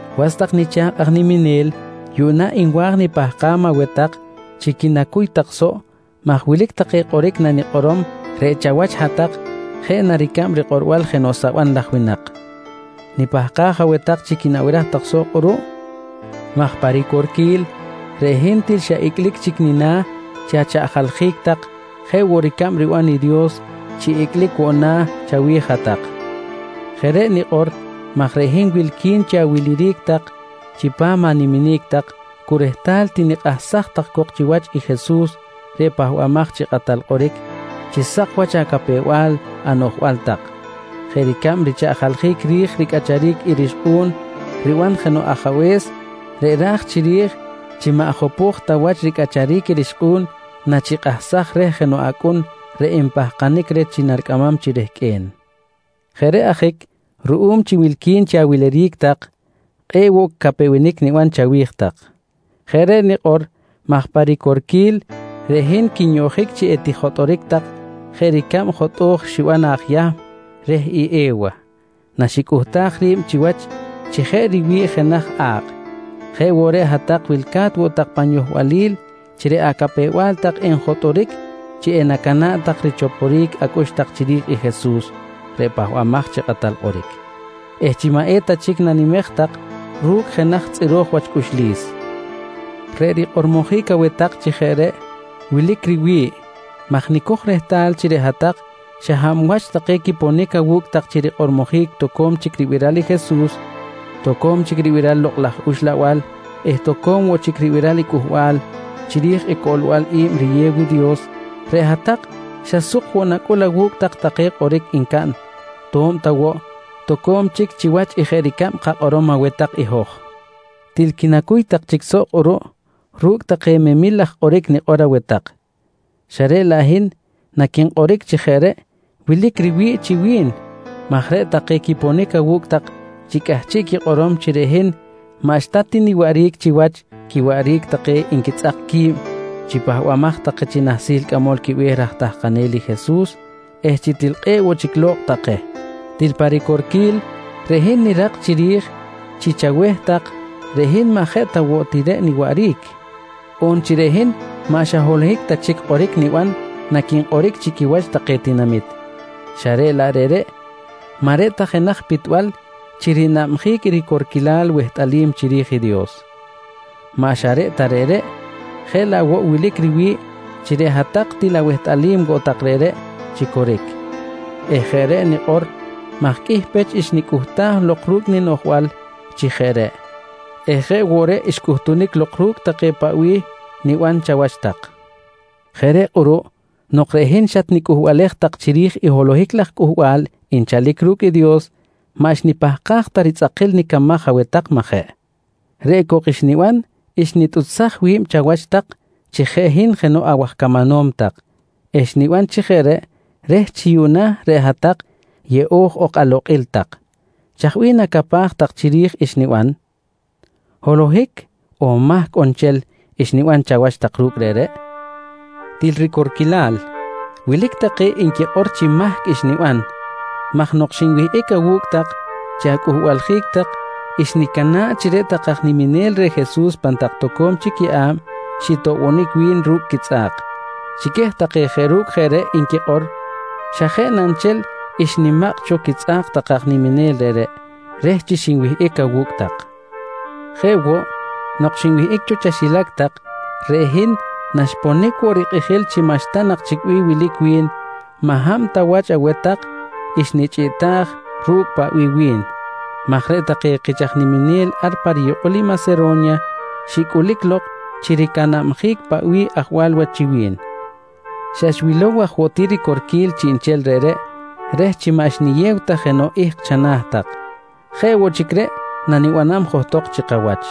Was tak nicha̱kꞌ aj niminel yuꞌna nwa̱j nipahkam aweh tak chi quinacuy tak soꞌ maj wilic take kꞌoric nanikꞌorom reꞌ chawach hat-tak jeꞌ na ricab rikꞌorbal jenoꞌ saban laj winak. Nipahkaj aweh tak chi quinabiraj tak soꞌ kꞌuruꞌ maj pa ricorquil reꞌ hin til xa icꞌlic chic nina̱ chi achaꞌjaljic tak jeꞌ woꞌ ricab riban i Dios chi icꞌlic woꞌ na̱ chawi̱j hat-tak. Jeꞌ reꞌ nikꞌor maj reꞌ hin wilqui̱n chi awiliric tak chipam animinic tak cu rehtal tinikꞌahsaj tak cok chiwach i Jesus reꞌ Pahbamaj chi Kꞌatal Kꞌoric chi sak wach acapew-bal anoꞌjbal tak jeꞌ ricab richaꞌjaljic ri̱j ricꞌacharic i rixkꞌu̱n riban jenoꞌ ajabe̱s reꞌ ra̱j chiri̱j chi maꞌ jopo̱j ta wach ricꞌacharic i rixkꞌu̱n nachikꞌahsaj reh jenoꞌ acꞌun reꞌ enpahkanic reh chi naricꞌamam chi rehqꞌue̱n. Jeꞌ reꞌ ajic ruꞌum chi wilqui̱n chi awiliric tak kꞌe̱ꞌ woꞌ capewenic niban chawi̱j tak. Jeꞌ reꞌ nikꞌor maj pa ricorquil reꞌ hin quinyoꞌjic chi etijotꞌoric tak jeꞌ ricab jotꞌo̱j xiban i aj Yahm reh i E̱wa na xicꞌuhtaj ri̱b chiwach chi jeꞌ riwi̱ꞌ jenaj a̱kꞌ jeꞌ woꞌ reꞌ hat-tak wilca̱t woꞌ tak pan yohbalil chi reꞌ acapew-bal tak enjotꞌoric chi enacana̱ꞌ tak richoporic acꞌux tak chiri̱j i Jesus reꞌ Pahbamaj chi Kꞌatal Kꞌoric eh chi maꞌ eta chic nanimej tak ru̱cꞌ jenaj tzꞌiro̱j wach cꞌuxlis. Reꞌ rikꞌormojic aweh tak chi jeꞌ reꞌ wilic riwi̱ꞌ maj nicoj rehtal chi reꞌ hat-tak xa hab wach take quiponic awu̱cꞌ tak chi rikꞌormojic toco̱m chic ribiral i Jesus, toco̱m chic ribiral i Lokꞌ laj Uxlabal eh toco̱m woꞌ chic ribiral cꞌuhbal chiri̱j i coꞌlbal i̱b riyew i Dios reꞌ hat-tak xa suk woꞌ nacꞌul awu̱cꞌ tak take kꞌoric ncaꞌn to̱b ta woꞌ toco̱m chic chiwach i jeꞌ ricab kakꞌorom aweh tak i hoj. Til quinacuy tak chic soꞌ kꞌuruꞌ ru̱cꞌ take memil laj kꞌoric nikꞌor aweh tak, xa reꞌ laꞌ hin naquinkꞌoric chi jeꞌ reꞌ wilic riwi̱ꞌ chi wi̱n maj reꞌ take quiponic awu̱cꞌ tak chi cꞌahchiꞌ quikꞌorom chi reꞌ hin maꞌxta ti niwaꞌric chiwach quiwaꞌric take nquitzꞌak qui̱b chi pahbamaj take chi nahsil cꞌamol quibe̱h raj tahkanel i Jesus eh chi til kꞌe̱ꞌ woꞌ chic lo̱kꞌ take. Til pa ricorquil, reꞌ hin nirak chiri̱j chi chaweh tak reꞌ hin maꞌ jeꞌ ta woꞌ ti reꞌ niwaꞌric on chi reꞌ hin maꞌ xa holohic ta chic kꞌoric niban naquinkꞌoric chi quiwach take tinamit xa reꞌ laꞌ reꞌreꞌ maꞌ reꞌ ta jenaj pitbal chi rinabjic i ricorquil wehtꞌalim chiri̱j i Dios. Maꞌ xa reꞌ ta reꞌreꞌ, jeꞌ laꞌ woꞌ wilic riwi̱ꞌ chi reꞌ hat-tak til awehtꞌalim woꞌ tak reꞌreꞌ chi coric eh jeꞌ reꞌ nikꞌor maj qꞌuih pech xnicꞌuhtaj lok ru̱cꞌ ninoꞌjbal chi jeꞌ reꞌ eh jeꞌ woꞌ reꞌ xcꞌutunic lok ru̱cꞌ take paꞌ bih niban chawach tak. Jeꞌ reꞌ kꞌuruꞌ nok reꞌ hin xatnicꞌuhbalej tak chiri̱j i holohic laj cꞌuhbal nchalic ru̱cꞌ i Dios, maꞌ xnipahkaj ta ritzꞌakil nicamaj aweh tak, majeꞌ? Reꞌ cok xniban xnitꞌuchsaj wi̱b chawach tak chi jeꞌ hin jenoꞌ awaj camanom tak eh xniban chi jeꞌ reꞌ reh chi yuꞌna reꞌ hat-tak yeꞌo̱j ok alokꞌil tak. Chaj bih nacapaj tak chiri̱j i xniban? Holohic on mahc on nchel xniban chawach tak ru̱cꞌ reꞌreꞌ? Til ricorquilal, wilic take nquikꞌor chi mahc xniban maj nok xinwihꞌic awu̱cꞌ tak chi acꞌuhbaljic tak xnicana̱ꞌ chi reꞌ take aj niminel reh Jesus pan tak toco̱m chic yeꞌa̱b xitoꞌbonic wi̱n ru̱cꞌ quitzꞌa̱k. Chi queh take jeꞌ ru̱cꞌ jeꞌ reꞌ nquikꞌor xa jeꞌ na nchel xnimakꞌ cho quitzꞌa̱k take aj niminel reꞌreꞌ reh chi xinwihꞌic awu̱cꞌ tak. Jeꞌ woꞌ nok xinwihꞌic cho chaxilac tak, reꞌ hin naxponic woꞌ rikꞌijil chi maꞌxta nak chic bih wilic wi̱n maꞌ hab ta wach aweh tak xnichꞌiꞌtaj ru̱cꞌ paꞌ bih wi̱n maj reꞌ take kich aj niminel ar pa riyukꞌul i Masero̱nya xicꞌulic lok chi ricanabjic paꞌ bih ajwal wach chi wi̱n. Xa xwilow aj woꞌ ti ricorquil chiꞌnchel reꞌreꞌ reh chi maꞌ xniyew ta jenoꞌ ihk chana̱ tak. Jeꞌ woꞌ chic reꞌ nanibanam johtok chi kawach.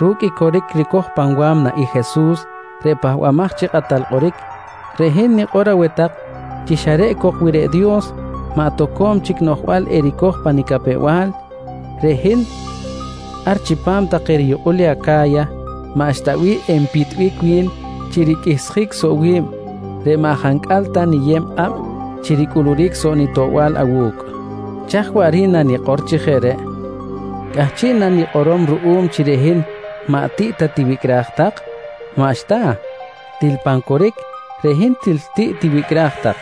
Ru̱cꞌ i coric ricoj pan wa̱mna i Jesus reꞌ Pahbamaj chi Kꞌatal Kꞌoric, reꞌ hin nikꞌor aweh tak chi xa reꞌ cok wi reꞌ Dios maꞌ toco̱m chic noꞌjbal ericoj pa nicapew-bal, reꞌ hin ar chipam take riyukꞌul i Aca̱ya maꞌxta bih enpitbic wi̱n chi riqꞌuihsjic soꞌ wi̱b reꞌ maꞌ jancꞌal ta niyeb kꞌab chi ricꞌuluric soꞌ nitoꞌbal awu̱cꞌ. Chaj waꞌric nanikꞌor chi jeꞌ reꞌ? Cꞌahchiꞌ na nikꞌorom ruꞌum chi reꞌ hin maꞌ tiꞌ ta tiwicꞌraj tak? Maꞌxta! Til pan coric reꞌ hin til tiꞌ tiwicꞌraj tak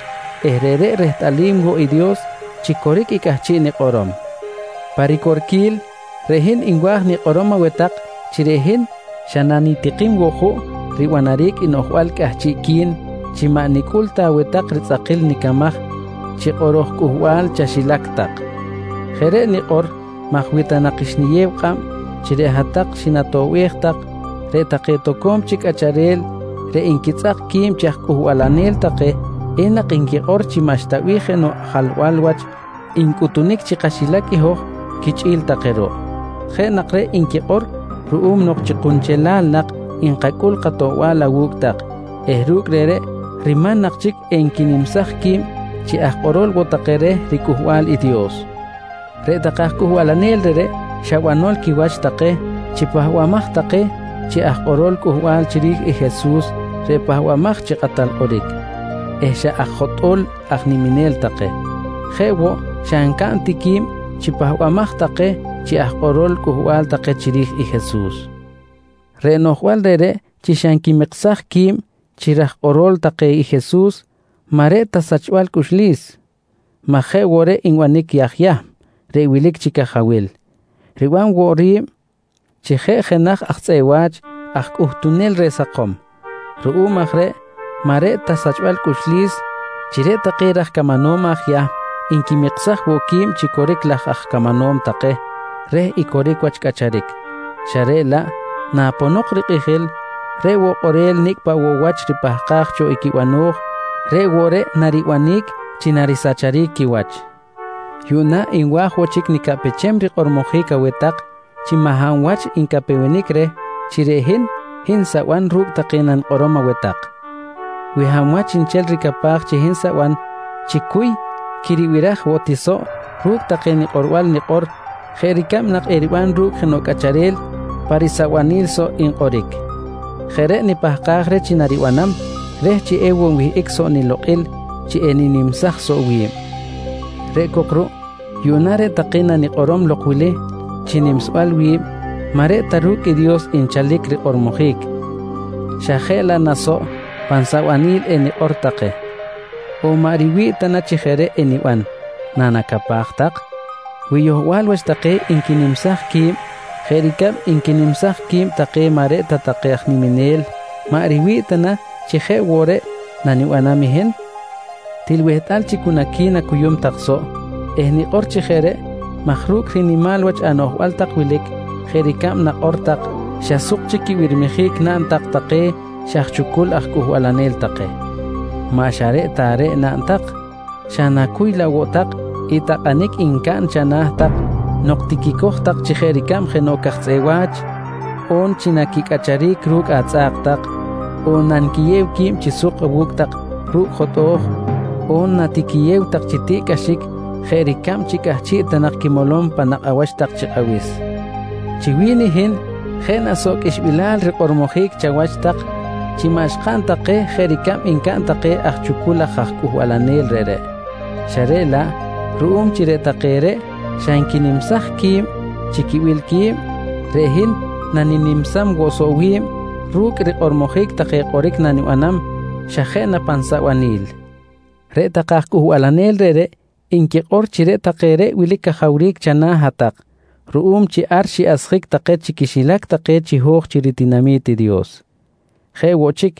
eh reꞌreꞌ rehtꞌalim woꞌ i Dios chi coric i cꞌahchiꞌ nikꞌorom. Pa ricorquil reꞌ hin nwa̱j nikꞌorom aweh tak chi reꞌ hin xa nanitikim woꞌ juꞌ ribanaric i noꞌjbal cꞌahchiꞌqui̱n chi maꞌ nicꞌul ta aweh tak ritzꞌakil nicamaj chi kꞌoro̱j cꞌuhbal chaxilac tak. Jeꞌ reꞌ nikꞌor maj wi ta nak xniyew kꞌab chi reꞌ hat-tak xinatoꞌbej tak, reꞌ take toco̱m chic cꞌacharel reꞌ nquitzꞌak qui̱b chi aj cꞌuhbalanel take enak nquikꞌor chi maꞌxta bih jenoꞌ jalbal wach ncꞌutunic chi kaxilac i hoj quichꞌi̱l take ruꞌ. Jeꞌ nak reꞌ nquikꞌor ruꞌum nok chi kunchelal nak nkacꞌul katoꞌbal awu̱cꞌ tak eh ru̱cꞌ reꞌreꞌ riman nak chic enquinimsaj qui̱b chi aj kꞌorol woꞌ take reh riCꞌuhbal i Dios. Reꞌ take aj cꞌuhbalanel reꞌreꞌ xa banol quiwach take chi pahbamaj take chi aj kꞌorol cꞌuhbal chiri̱j i Jesus reꞌ Pahbamaj chi Kꞌatal Kꞌoric eh xa aj jotꞌo̱l aj niminel take. Jeꞌ woꞌ xa ncaꞌn ti qui̱b chi pahbamaj take chi aj kꞌorol cꞌuhbal take chiri̱j i Jesus. Reꞌ noꞌjbal reꞌreꞌ chi xa nquimiksaj qui̱b chi raj kꞌorol take i Jesus maꞌ reꞌ ta sachbal cꞌuxlis maj jeꞌ woꞌ reꞌ nbanic i aj Yahm reꞌ wilic chi cajawil, riban woꞌ ri̱b chi jeꞌ jenaj aj tzꞌeꞌ wa̱ch aj cꞌuhtunel reh sakom. Ruꞌum aj reꞌ maꞌ reꞌ ta sachbal cꞌuxlis chi reꞌ take raj camanom aj Yahm nquimiksaj woꞌ qui̱b chi coric laj aj camanom take reh i coric wach cꞌacharic xa reꞌ laꞌ naponok rikꞌijil, reꞌ woꞌ kꞌorel nicꞌ paꞌ woꞌ wach ripahkaj cho i quibano̱j reꞌ woꞌ reꞌ naribanic chi narisacharic quiwach. Yuꞌna nwa̱j woꞌ chic nicaꞌpechem rikꞌormojic aweh tak chi maꞌ hab wach ncapewenic reh chi reꞌ hin, hin saban ru̱cꞌ take nanikꞌorom aweh tak. Wi hab wach nchel ricapaj chi hin saban, chicuy quiribiraj woꞌ ti soꞌ ru̱cꞌ take nikꞌorbal nikꞌor jeꞌ ricab nak eriban ru̱cꞌ jenoꞌ cꞌacharel pan risabanil soꞌ nkꞌoric. Jeꞌ reꞌ nipahkaj reh chi naribanam reh chi ewoꞌ nwihꞌic soꞌ nilokꞌil chi eninimsaj soꞌ wi̱b. Reꞌ cok ruꞌ, yuꞌna reꞌ take nanikꞌorom lok wili chi nimsbal wi̱b maꞌ reꞌ ta ru̱cꞌ i Dios nchalic rikꞌormojic xa jeꞌ laꞌ na soꞌ pan sabanil enikꞌor take. On maꞌ riwi̱ꞌ ta chi jeꞌ reꞌ eniban, nanacapaj tak? Wi yohbal wach take nquinimsaj qui̱b jeꞌ ricab nquinimsaj qui̱b take maꞌ reꞌ ta take aj niminel maꞌ riwi̱ꞌ ta na chi jeꞌ woꞌ reꞌ nanibanam hin? Til wehtꞌal chi cu naqui̱nacuyum tak soꞌ eh nikꞌor chi jeꞌ reꞌ maj ru̱cꞌ rinimal wach anoꞌjbal tak wilic jeꞌ ricab nakꞌor tak, xa suk chic quibirmijic naꞌn tak take xa aj chucul aj cꞌuhbalanel take! Maꞌ xa reꞌ ta reꞌ naꞌn tak, xa nacuy laꞌ woꞌ tak i takꞌanic ncaꞌn chana̱ tak nok tiquicoj tak chi jeꞌ ricab jenoꞌ caj tzꞌeꞌ wa̱ch, on naquicꞌacharic ru̱cꞌ atzꞌa̱k tak, on nanquiyew qui̱b chi suk awu̱cꞌ tak ru̱cꞌ jotꞌo̱j, on natiquiyew tak chi tiꞌcꞌaxic jeꞌ ricab chi cꞌahchiꞌ ta nak quimolom panakꞌ awach tak chi kꞌabis. Chi wi̱n i hin jeꞌ na soꞌ qꞌuixbilal rikꞌormojic chawach tak chi maꞌ xkaꞌn ta keh jeꞌ ricab ncaꞌn take aj chucul laj aj cꞌuhbalanel reꞌreꞌ, xa reꞌ laꞌ ruꞌum chi reꞌ take reꞌ xa nquinimsaj qui̱b chi quibil qui̱b, reꞌ hin naninimsam woꞌ soꞌ wi̱b ru̱cꞌ rikꞌormojic take kꞌoric nanibanam xa jeꞌ pan sabanil. Reꞌ take aj cꞌuhbalanel reꞌreꞌ nquikꞌor chi reꞌ take reꞌ wilic cajawric chana̱ hat-tak ruꞌum chi ar xiꞌasjic take chi quixilac take chiho̱j chi ritinami̱t i Dios. Jeꞌ woꞌ chic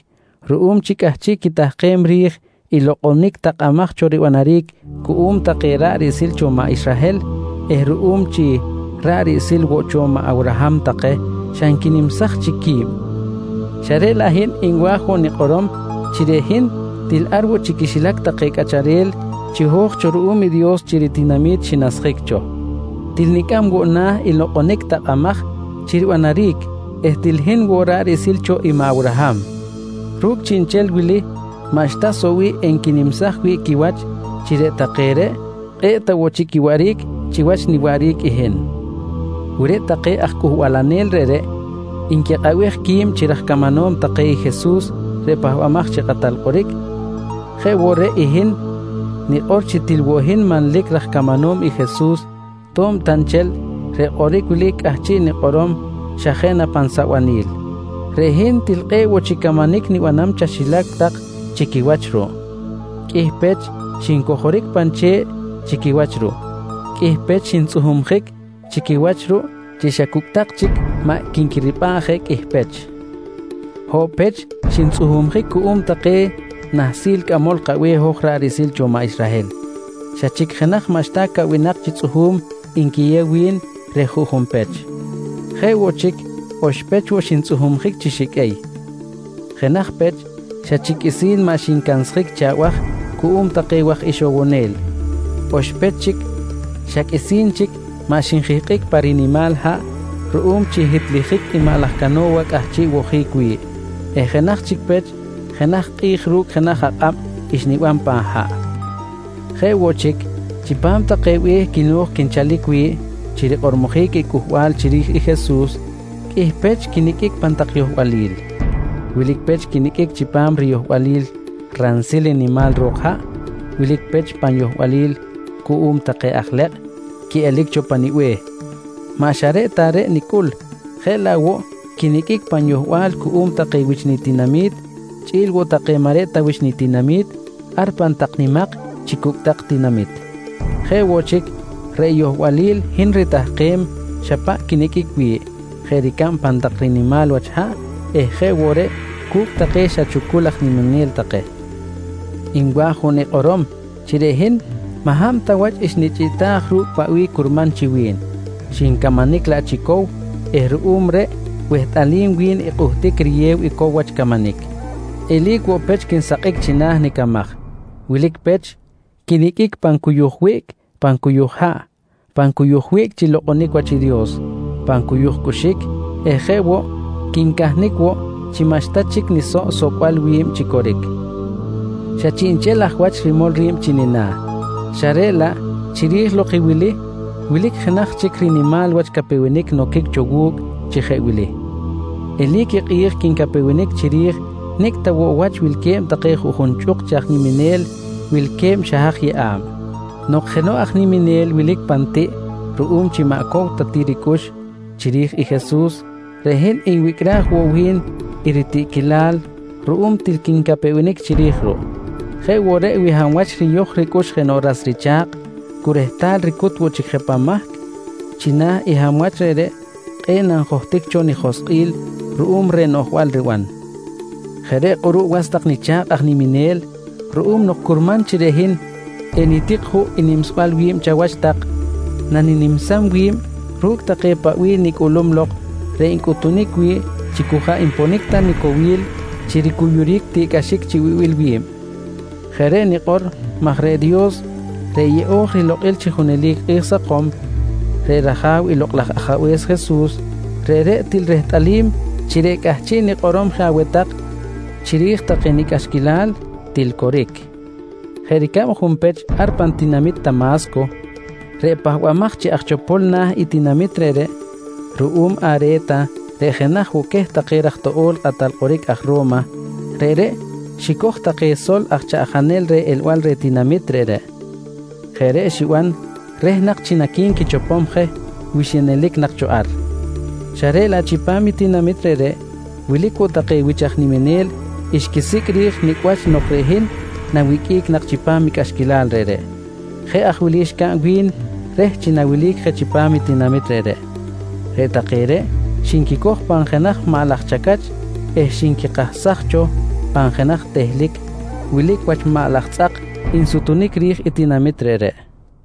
ruꞌum chi cꞌahchiꞌ quitahkem ri̱j i lokꞌonic takꞌamaj cho ribanaric cuꞌum take ra̱ꞌ riꞌsil cho maꞌ Israhel eh ruꞌum chi ra̱ꞌ riꞌsil woꞌ cho maꞌ Awraham take xa nquinimsaj chic qui̱b. Xa reꞌ laꞌ reꞌ hin nwa̱j woꞌ nikꞌorom chi reꞌ hin til ar woꞌ chi quixilac take cꞌacharel chiho̱j cho ruꞌum i Dios chi ritinami̱t xinasjic cho. Til nicꞌam woꞌ na̱ i lokꞌonic takꞌamaj chi naribanaric eh til hin woꞌ ra̱ꞌ riꞌsil cho i maꞌ Awraham. Ru̱cꞌ chiꞌnchel wili maꞌxta soꞌ bih enquinimsaj wi̱ꞌ quiwach chi reꞌ take reꞌ kꞌe̱ꞌ ta woꞌ chic quiwaꞌric chiwach niwaꞌric i hin. Wi reꞌ take aj cꞌuhbalanel reꞌreꞌ nquikꞌabej qui̱b chi raj camanom take i Jesus reꞌ Pahbamaj chi Kꞌatal Kꞌoric, jeꞌ woꞌ reꞌ i hin nikꞌor chi til woꞌ hin manlic raj camanom i Jesus to̱b ta nchel reꞌ kꞌoric wili cꞌahchiꞌ nikꞌorom xa jeꞌ pan sabanil. Reꞌ hin til kꞌe̱ꞌ woꞌ chic camanic nibanam chaxilac tak chi quiwach ruꞌ. Qꞌuih pech xincojoric pan che̱ꞌ chi quiwach ruꞌ. Qꞌuih pech xintzꞌuhumjic chi quiwach ruꞌ chi xa cucꞌ tak chic maꞌ quinquiripꞌa̱ꞌ je qꞌuih pech. Hoꞌo̱b pech xintzꞌuhumjic cuꞌum queh take nahsil cꞌamol kabe̱h hoj ra̱ꞌ riꞌsil cho maꞌ Israhel, xa chic jenaj maꞌxta caꞌwinak chi tzꞌuhu̱m nquiyew wi̱n reh juꞌjun pech. Jeꞌ woꞌ chic oxpech woꞌ xintzꞌuhumjic chi xiqꞌuey. Jenaj pech xa chic qꞌuisi̱n maꞌ xincansjic chi abaj cuꞌum take waj ixowonel. Oxpech chic xa qꞌuisi̱n chic maꞌ xinjihkꞌic pa rinimal haꞌ ruꞌum chi hitlijic i maꞌ laj cano̱wa cꞌahchiꞌ wojic wi̱ꞌ eh jenaj chic pech, jenaj kꞌi̱j ru̱cꞌ jenaj akꞌab xniban pan haꞌ. Jeꞌ woꞌ chic, chipam take be̱h quino̱j quinchalic wi̱ꞌ chi rikꞌormojic i cꞌuhbal chiri̱j i Jesus, qꞌuih pech quiniqꞌuic pan tak yohbalil. Wilic pech quiniqꞌuic chipam riyohbalil ransil nimak tak ro̱k haꞌ. Wilic pech pan yohbalil cuꞌum take aj lekꞌ quiꞌelic cho pa nibe̱h. Maꞌ xa reꞌ ta reꞌ nicꞌul, jeꞌ laꞌ woꞌ quiniqꞌuic pan yohbal cuꞌum take wich nitinami̱t chꞌi̱l woꞌ take maꞌ reꞌ ta wich nitinami̱t ar pan tak nimak chi cucꞌtak tinamit. Jeꞌ woꞌ chic, reꞌ yohbalil hin ritahkem xa paꞌ quiniqꞌuic wi̱ꞌ jeꞌ ricab pan tak rinimal wach haꞌ eh jeꞌ woꞌ reꞌ cu̱cꞌ take xa chucul aj niminel take. Nwa̱j woꞌ nikꞌorom chi reꞌ hin maꞌ hab ta wach xnichꞌiꞌtaj ru̱cꞌ paꞌ bih curman chi wi̱n, xincamanic laꞌ chi cow eh ruꞌum reꞌ wehtꞌalim wi̱n i kꞌuhtic riyew i cow wach camanic. Eli̱c woꞌ pech quinsakꞌic china̱ nicamaj. Wilic pech quiniqꞌuic pan cuyuj wiꞌc pan cuyuj haꞌ, pan cuyuj wiꞌc chi lokꞌonic wach i Dios, pan cuyuj cꞌuxic eh jeꞌ woꞌ quincahnic woꞌ chi maꞌxta chic nisoꞌ socbal wi̱b chi coric. Xa chiꞌnchel aj wach rimol ri̱b chi nina̱, xa reꞌ laꞌ chiri̱j lok i wili, wilic jenaj chic rinimal wach capewenic noquic cho wu̱cꞌ chi jeꞌ wili: Eli̱c i kꞌi̱j quincapewenic chiri̱j nicꞌ ta woꞌ wach wilque̱b take juꞌjun chꞌuk chi aj niminel wilque̱b xa haj yeꞌa̱b. Nok jenoꞌ aj niminel wilic pan tiꞌ ruꞌum chi maꞌ cow ta ti ricꞌux chiri̱j i Jesus, reꞌ hin nwicꞌraj woꞌ wi̱n i ritiꞌquilal ruꞌum til quincapewenic chiri̱j ruꞌ. Jeꞌ woꞌ reꞌ wi hab wach riyoj ricꞌux jenoꞌ ras richa̱kꞌ cu rehtal ricut woꞌ chic je pan mahc, china̱ i hab wach reꞌreꞌ kꞌe̱ꞌ nanjohtic cho nijoskꞌil ruꞌum reh noꞌjbal riban. Jeꞌ reꞌ kꞌuruꞌ was tak nicha̱kꞌ aj niminel, ruꞌum nok curman chi reꞌ hin enitik juꞌ i nimsbal wi̱b chawach tak, naninimsam wi̱b ru̱cꞌ take paꞌ bih nicꞌulum lok reꞌ ncꞌutunic wi̱ꞌ chi cu jaꞌ nponic ta nicowil chi ricuyuric tiꞌ cꞌaxic chi wibil wi̱b. Jeꞌ reꞌ nikꞌor maj reꞌ Dios reꞌ yeꞌo̱j rilokꞌil chi junelic kꞌi̱j sakom, reꞌ rAja̱w i Lokꞌ laj Ajabe̱s Jesus, reꞌreꞌ til rehtꞌalim chi reꞌ cꞌahchiꞌ nikꞌorom je aweh tak chiri̱j take nicꞌaxquilal til coric. Jeꞌ ricab junpech ar pan tinamit Tama̱sco, reꞌ pahbamaj chi aj chopol na̱ i tinamit reꞌreꞌ ruꞌum Are̱ta reꞌ jenaj woꞌ queh take raj toꞌo̱l i kꞌatal kꞌoric aj Ro̱ma, reꞌreꞌ xicoj take sol aj chaꞌjanel reh elbal reh tinamit reꞌreꞌ, jeꞌ reꞌ xiban reh nak chi naqui̱nquichopom je wi xinelic nak cho ar. Xa reꞌ laꞌ chipam i tinamit reꞌreꞌ, wilic woꞌ take wich aj nimanel xquisicꞌ ri̱j nicꞌ wach nok reꞌ hin nawiqꞌuic nak chipam i cꞌaxquilal reꞌreꞌ. Jeꞌ aj wili xcaꞌn wi̱n reh chi nawelic jeꞌ chipam i tinamit reꞌreꞌ: Reꞌ take reꞌ xinquicoj pan jenaj maꞌ laj chacach eh xinquikahsaj cho pan jenaj tehlic wilic wach maꞌ laj tzꞌak nsutunic ri̱j i tinamit reꞌreꞌ.